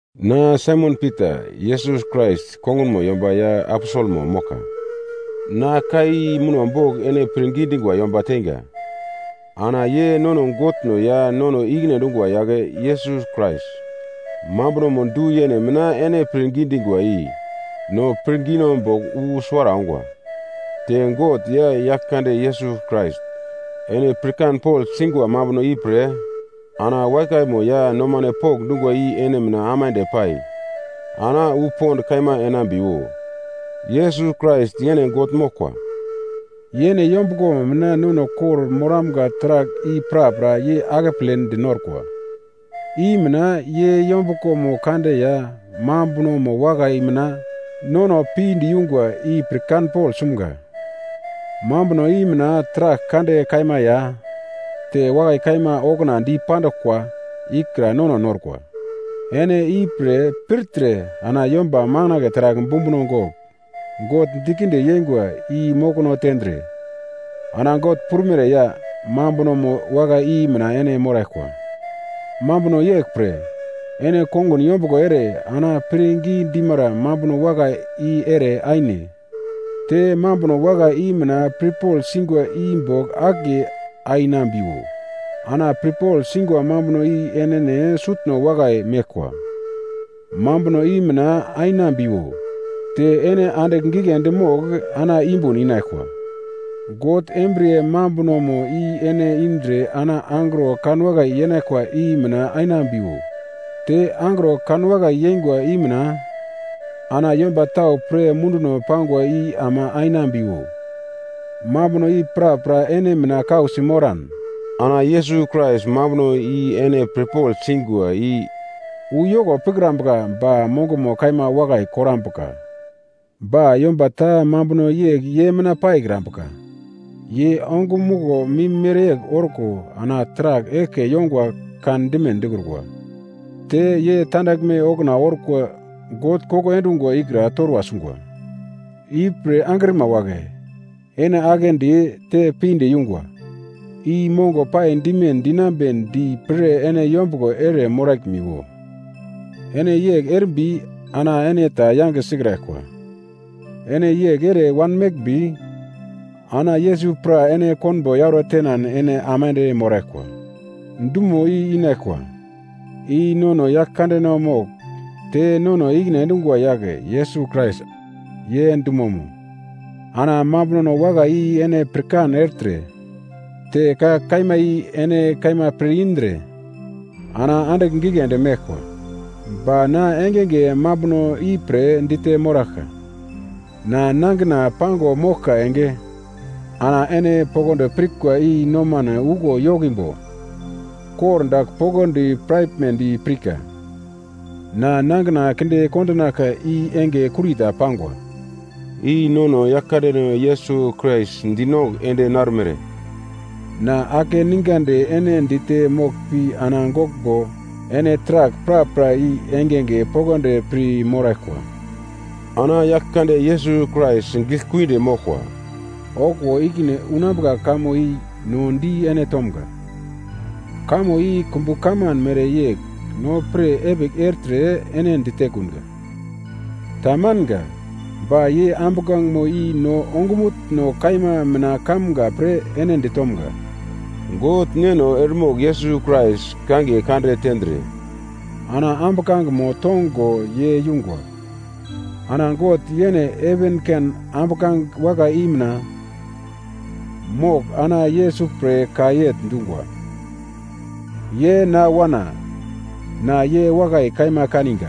Na Saimon Pita, Yesus Krais kongunmo yomba ya aposelmo moglka. Na ka i muno bogl ene pirngi dingwa yomba teinga. Ana ye nono Godno ya nono i-ikine endungwa yagle Yesus Krais mambunomo du-yene mina ene pirngi dingwa i no pirngino bogl wu suwara ongwa. Te God ya Yaglkande Yesus Krais, ene pirkanpogl singwa mambuno ipre ana wakaimo ya nomano pokndungwa i ene mina aimande pai ana wu pond kaima enambiwo. Yesus Krais yene God moglkwa. Yene yombuglomo mina nono kor-moramga taragl i prapra ye akepledi norkwa. I mina ye yombuglomo kande ya mambunomo wakai mina nono pinde yungwa i pirkanpogl sumga. Mambuno i mina taragl kande kaima ya te wakai kaima okuna dipanduglkwa ikra nono norkwa. Ene ipre pirtre ana yomba makandle taragl bumbuno gogl God dikinde yeingwa i mokono tendre, ana God prumere ya mambunomo wakai i mina ene moraglkwa. Mambuno yeglpre, ene kongun yombuglo ere ana pirngi dimara mambuno wakai i ere aine, te mambuno wakai i mina pirpogl singwa i bogl akiye ainambiwo, ana pirpogl singwa mambuno i enene sutno wakai meglkwa, mambuno i mina ainambiwo. Te ene andigl giglendi mogl ana yumbun inaglkwa, God embriye mambunomo i ene indre ana angro kanwakai yenaglkwa i mina ainambiwo. Te angro kanwakai yengwa i mina ana yomba tau pre munduno pangwa i ama ainambiwo. Mambuno i prapra ene mina kausi moran ana Yesus Krais mambunomo i ene pirpogl singwa i wu yoko pikrambuka ba mongomo kaima wakai korambuka. Ba yomba ta mambuno yegl ye mina paikrambuka, ye ongumuglo mim mereyegl orko ana taragl eglke yongwa kandime dikrukwa. Te ye tandaglme okuna orkwa God koko endungwa ikra torwa sungwa. Ipre angrima wagle, ene aglendi te pinde yungwa i mongo pai dime dinambedi pre ene yombuglo ere moraglmiwo. Ene yegl erimbi ana ene ta yange sikraglkwa. Ene yegl ere wanmeglmbi ana Yesus pra ene konbo yauro tenan ene aimande moraglkwa dumo i inaglkwa, i nono Yaglkandeno mogl te nono i-ikine endungwa yagle Yesus Krais, ye dumomo. Ana mambuno wakai i ene pirkan ertre te ka kaima i ene kaima pir-indre ana andigl giglendi meglkwa, ba na engenge mambuno ipre dite moraglka. Na nangina pango moglka enge ana ene poglodi pirkwa i nomano uglo yokimbo kordagl poglodi piraglmedi pirka. Na nangina kinde kondonaglka i enge kurita pangwa. I nono Yaglkandeno Yesus Krais dinongugl ende narumere. Na akeningandi ene dite moglpi ana goglmbo ene taragl prapra i engenge poglodi pir moraglkwa. Ana Yaglkande Yesus Krais giglekuidi moglkwa okuwo ikine unambuka kamo i no di ene tomga. Kamo i kumbu kaman mereyegl no pir epigl ertre ene ditekunga, tamanga, ba ye ambuglangemo i no ongumutno kaima mina kamga pre ene ditomga. God Neno eremogl Yesus Krais kangiye kande tendre ana ambuglangemo tongo ye yungwa. Ana God yene heven ken ambuglange wakai i mina mogl ana Yesus pre ka yegl dungwa, “Ye na Wana, na ye wakai kaima kaniga,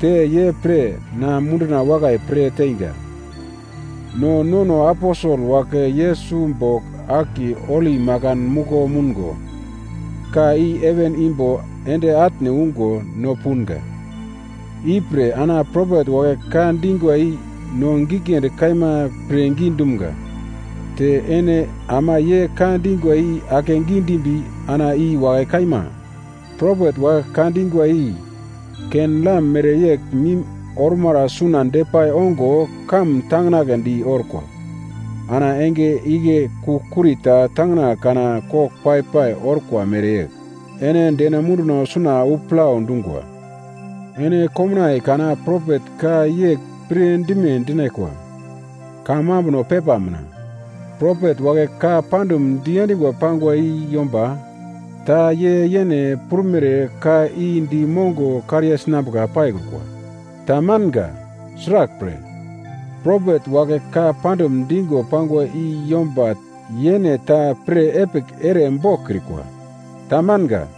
te ye pre na munduna wakai pre teingwa.” No nono aposel wagle Yesus bogl akiye holi makan muglo moungo, ka i heven imbo ende atne ungo no punga. Ipre ana propet wagle ka dingwa i no giglendi kaima pirngi dumga. Te ene ama ye ka dingwa i akegi dimbi ana i wakai kaima propet wagle ka dingwa i ken-lam mereyegl mim ormara suna depai ongo kamun tanginagledi orko, ana enge igle kugl-kuri ta tangina kana kogl pai-pai orkwa mereyegl, ene deno munduno suna wu plau dungwa. Ene komnaiye kana propet ka yegl pirdime dinaglkwa, kamambuno pepa mina, propet wagle ka pandum diendingo pangwa i yomba ta ye yene prumere ka i di mongo kariye sinambuka paikrukwa. Tamanga. Sraglpre, propet wagle ka pandum digo pangwa i yomba yene ta pirepigl ere boglkrikwa, tamanga.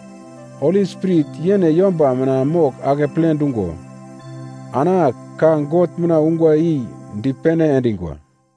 Holi Spirit yene yomba mina mogl akeple dungo ana ka God mina ungwa i dipene endingwa.